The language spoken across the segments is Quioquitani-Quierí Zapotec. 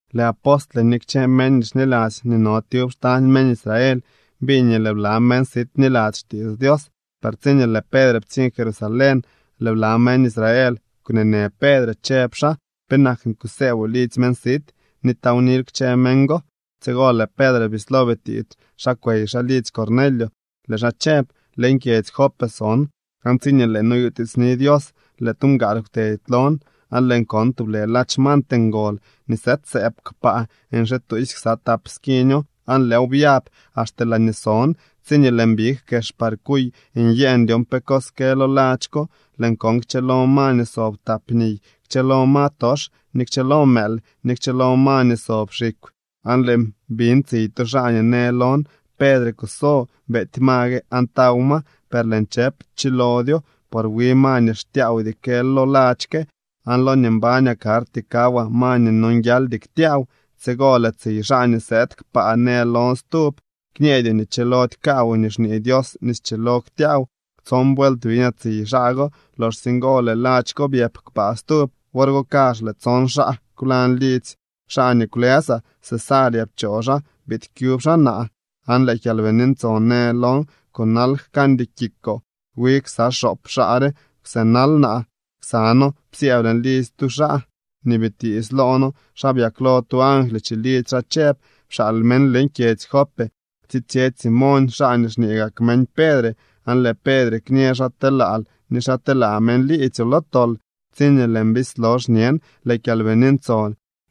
Lëë apostle ni kchë meñ nii xniladzy nii no tyub xtañ meñ Israel biñ nii lëë bla meñ sit bniladzy xtiits Dios. Per tsiñee lëë Pedre ptsiñ Jerusalén, lëë bla meñ Israel kwneenë Pedre, chëb xaa: —¿Penak nii kusëëboo lidzy meñ sit, ni tawnil kchë meñ go? Tsigo lëë Pedre bislo bitiits xa kwey xaa lidzy Cornelio, lëë xaa chëb: —Leñ kyedzy Jope son, aan tsiñee lëën noyutiitsni Dios, lëë tu mgaal kwtedy lon, aan lëën kon tublë ladx mant ngol nii sëëdsëëb kpaa nxituusy ksa tap skiño aan lëëw byab axte laañee son. Tsiñee lëën big kex par kuy nyëën dyon pe cos kë lo ladx ko, lëën kon kchëlo ma nii sob tap niy, kchëlo ma tox, ni kchëlo mëël, ni kchëlo ma nii sob xikw. Aan lëën biñ tsiy tu xaa nii në lon: “Pedre, kuso, beety ma gue aan taw ma.” Per lëën chëp: “Chilodyo, por wi ma nii xtyaawdy kë lo ladx ke, aan lo nii mbañaa karty kawaa ma nii nonguialdy ktyaaw.” Tsigo lëë tsiy xaa nii sëëd kpaa në lon stub: “Kñeedyoo nii chilody kaawoo nii xñee Dios nii schilo ktyaaw.” Tson vuelt biñaa tsiy xaa go. Loxsye ngo lëë ladx ko byëp kpaa stub. Wor go kazh lëë tson xaa kwlañ lidzy xaa nii kwlësaa. Cesarea pchoo xaa biid kyub xaa naa. Aan lëë Kyalbini Ntson në lon: “Kunal, jkañdy kikoo.” Wi ksa xoop xaa re kwsënal naa, ksa noo psyëëb leñ lidzy tu xaa nii bitiits loo noo xa byaklo tu angly chilidzy xaa chëb: “Pxaal meñ leñ kyedzy Jope tsitsyetsy Simoñ, xaa nii xñee gak meñ Pedre. Aan lëë Pedre kñë xa telaal ni xa telaa meñ liidzyoo lo tol.” Tsiñee lëën bislo xñen, lëë Kyalbini Ntson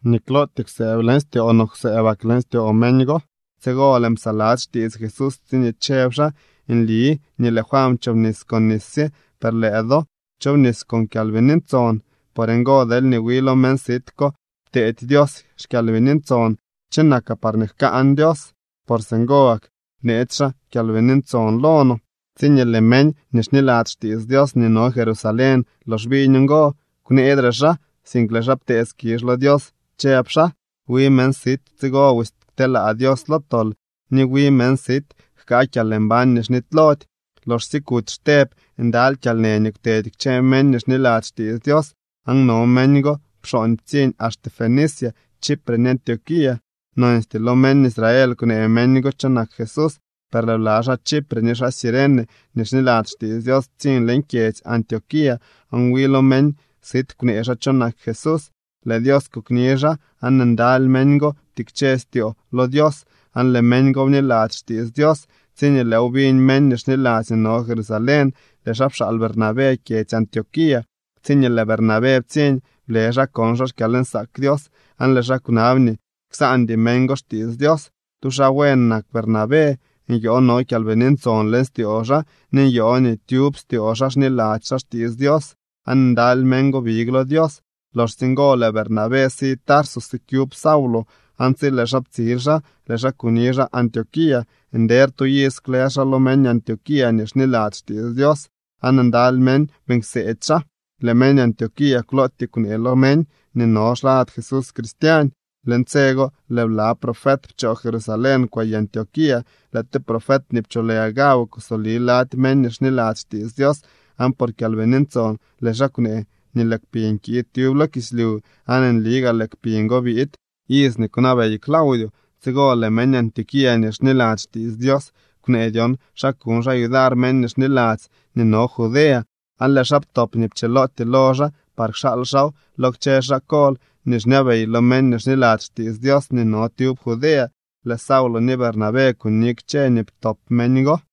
nii klootyee kwsëëb leñ styoo no kwsëëbak leñ styoo meñ go. Tsigo lëën psaladzy xtiits Jesús tsiñee chëb xaa: “Nli nii lëë Juan pchoobnis con nis sye, per lëë do chobnis con Kyalbini Ntson.” Por ngo, deelñee wi lo meñ sit ko pteedy Dios xKyalbini Ntson, ¿cho nakaa parñee jkaan Dios? Por singo gak bneetsy xaa Kyalbini Ntson lo no. Tsiñee lëë meñ nii xniladzy xtiits Dios nii no Jerusalén lox biñ ngo, kwneedre xaa, sink lëë xaa ptee skizh lo Dios chëb xaa: —¡Wi meñ sit tsigo busy kteelaa Dios lo tol ni wi meñ sit jkaa kyalmbañ nii xnitylody! Loxsye kuty Xteb, ndaly kyalnë nii kwtedy kchë meñ nii xniladzy xtiits Dios, aan no meñ go pxooñ ptsiñ axte Fenicia, Chipre ni Antioquía. Nonstyee lo meñ Israel kwnee meñ go cho nak Jesús. Per lëë bla xaa Chipre ni xaa Cirene nii xniladzy xtiits Dios ptsiñ leñ kyedzy Antioquía aan wi lo meñ sit kwnee xaa cho nak Jesús. Lëë Dios kokni xaa, aan ndaly meñ go ptikche styoo lo Dios aan lëë meñ go bniladzy xtiits Dios. Tsiñee lëëw biñ meñ nii xniladzy nii no Jerusalén, lëë xaa pxaal Bernabé kyedzy Antioquía. Tsiñee lëë Bernabé ptsiñ, ble xaa kon xaa xkyalnsaak Dios aan lëë xaa kwnab nii ksaandy meñ go xtiits Dios. Tu xaa buen nak Bernabé. Nyoo no Kyalbini Ntson leñ styoo xaa ni nyoo nii tyub styoo xaa xniladzy xaa xtiits Dios. Aan ndaly meñ go big lo Dios. Loxsye ngo lëë Bernabé si Tarso sikyub Saulo. Aan tsi lëë xaa ptsil xaa, lëë xaa kuni xaa Antioquía. Nder tu iz kwlës xaa lo meñ Antioquía nii xniladzy xtiits Dios aan ndaly meñ beeñ kseedy xaa. Lëë meñ Antioquía klootyee kwnee lo meñ nii no xlad Jesús Cristiañ. Leñ tse go lëë bla profet pchoo Jerusalén kwey Antioquía. Lëë tu profet nii pcholë Agabo kusoli lady meñ nii xniladzy xtiits Dios, aan por Kyalbini Ntson lëë xaa kwnee nii lëë kpiñ kiid tyub lo kislyu, aan nli gaa lëë kpiñ go biid iz nii kwnabey Claudio. Tsigo lëë meñ Antioquía nii xniladzy xtiits Dios kwnee dyon xa kuñ xaa yudar meñ nii xniladzy nii no Judea. Aan lëë xaa ptop nii pchilootyee lo xaa par kxaal xaaw lo kchë xaa kol nii xñabey lo meñ nii xniladzy xtiits Dios nii no tyub Judea. Lëë Saulo ni Bernabé kuni kchë nii ptop meñ go.